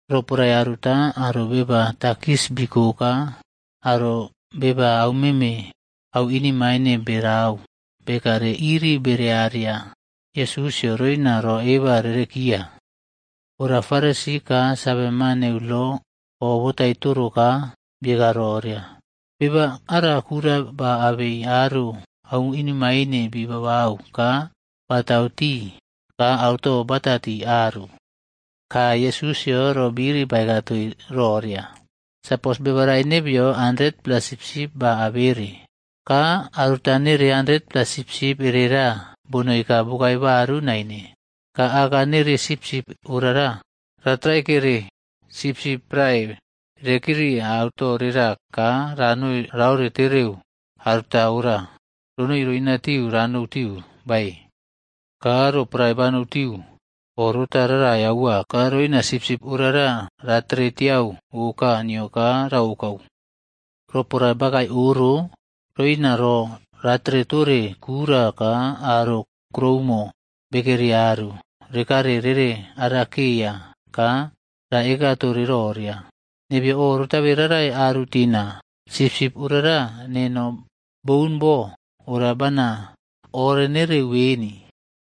Roporae aruta aro beba takis biko ka aro beba aumeme au inemaine berau bekare iriꞌbere ariya Yesusꞌyo roina ro eba rerekiya. Ora Farisi ka saveman neu lo obotai toro ka bieka roria, “Beba ara kura ba abei aro au inemaine bi babau ka batau tii ka auto bata tii aru.” Ka Yesusꞌyo ro biri baeka toii roria, “Sapos beba rae nebeyo 100-pla sipsip ba abere, ka aruta nere 100-pla sipsip erera bonoi ka bokae baru naine. Ka aka nere sipsip orara, ratraikere sipsip prae rekeri auto rera ka roina raore tereu aruta ora ronoi roinatiu ranou tiu, bae? Ka roporae banou tiu, orota rarai aua ka roina sipsip orara ratere tiau oka nio ka raokau. Roporae bakae oro, roina ro ratere tore kura ka aro kroumo bekeri aru rekare rereꞌarakeya ka ra ekatore roria, ‘Nebeyo o rotabe rarai aru tina, sipsip orara neno boꞌun bo, ora bana orenereu beni.’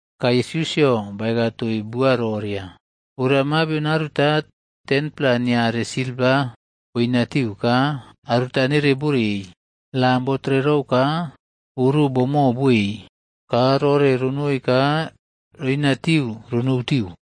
Ka Yesusꞌyo baeka toii bua roria, “Ora mabion aruta 10-pla niare silva boinatiu ka aruta nere borei. Lam botrerou ka oro boꞌmo boei ka roꞌore ronoi ka roina tiu ronou tiu.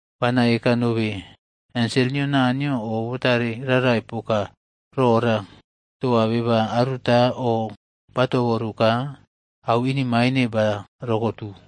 Bana eka nobe, ensel nio Naniyo o botare rarai poka rora toa beba aruta o batoboru ka au inemaine ba rokotu.”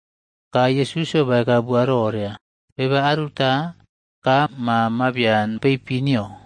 Ka Yesusꞌyo baeka bua roria, “Beba aruta ka ma mabian peipin nio.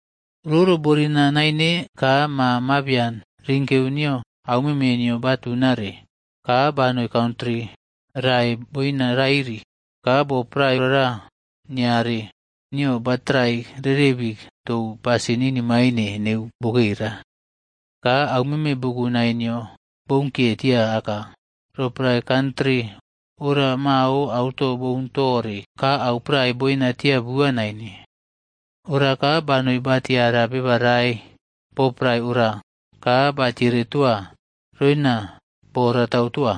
“Roro borina naine ka ma mabian rinkeu nio aumeme nio batunare, ka banoi kantri rae boina rairi. Ka bo prae ora niare nio batrai rerebi tou pasin inemaine neu bokera. Ka au meme bukunai nio bounkiye tia aka, roporae kantri ora mao auto boun tore ka au prae boina tia bua naine. Ora ka banoi ba tiara beba rae bo prae ora ka batiere toa roina boratau toa.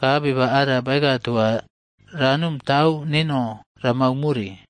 Ka beba ara baeka toa ranom tau neno ramau more.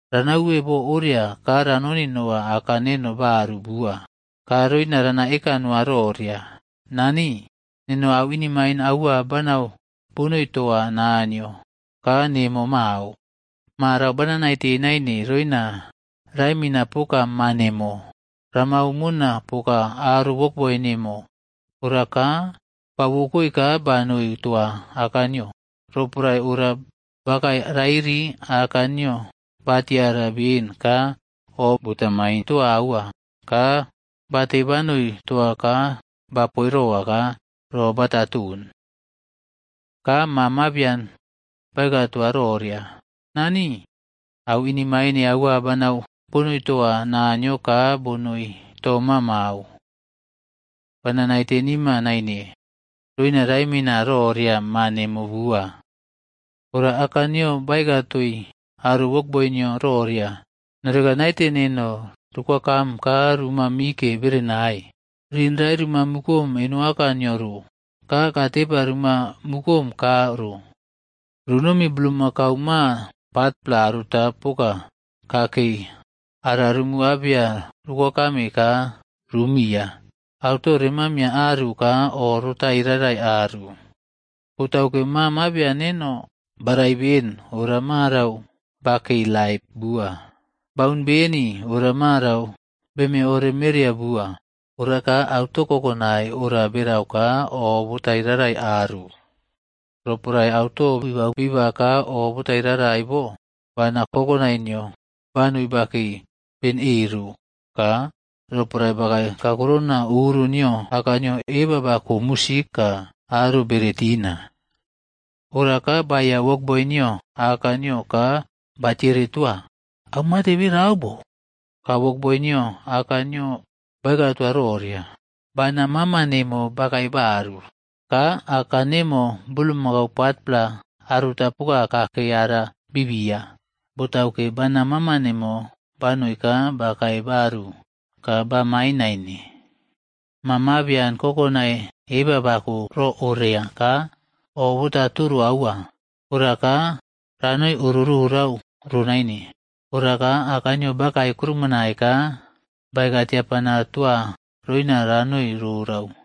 Rana uwe bo oria ka ranoni noa aka neno baru bua, ka roina rana eka noa roria, ‘Nani, neno au inemaine aua banau bonoi toa Naniyo ka nemo mao. Marau bana naite naine roina raemina poka ma nemo. Ramau mona poka aro wokboi nemo.’ Ora ka ba wokoe ka banoi toa aka nio. Roporae ora bakae rairi, aka nio batiara beni ka o bota main toa aua. Ka bate banoi toa ka ba poiroa ka ro bata ton. “Ka ma mabian baeka toa roria, ‘Nani, au inemaine aua banau bonoi toa Naniyo ka bonoi toma mao. Bana naite nima naine roina raemina roria ma nemo bua.’ “Ora aka nio baeka toii aro wokboi nio roria, ‘Noreka naite neno rokwakam ka ruma mike berenai. Ring rae ruma mukom eno aka nio ro ka kaa tepa ruma mukom kaa ro. Runomi bulmakau ma patpla aruta poka kakei ara rumu abeya rukokame ka rumiya. Auto rema miiya aru ka oꞌrotai rarai aru. Botauke ma mabian neno barai beni ora marau ba kei laip bua, baꞌun beni, ora marau beme ore mereya bua.’ Ora ka auto kokonai ora berau ka oꞌbotai rarai aru. “Roporae auto bibau biba ka o botararai bo, bana kokonai nio banoi bakei ben e ro. Ka roporae bakae kakurona oro nio aka nio, eba bako musik ka aro bere tina. Ora ka baeiya wokboi nio aka nio ka ba tiere toa, ‘Au mate berau bo?’ Ka wokboi nio aka nio baeka toa roria, ‘Bana mama nemo bakae baru, ka aka nemo bulmakau patpla aruta poka kakei ara biꞌbiya, botauke bana mama nemo banoi ka bakae baru ka bamain naine.’ “Ma mabian kokonai eba bako ro oria ka oꞌ bota toro aua, ora ka ranoi oro rorau ro naine. Ora ka aka nio bakae kuroumonai ka baeka tiapana toa roina ranoi rorau.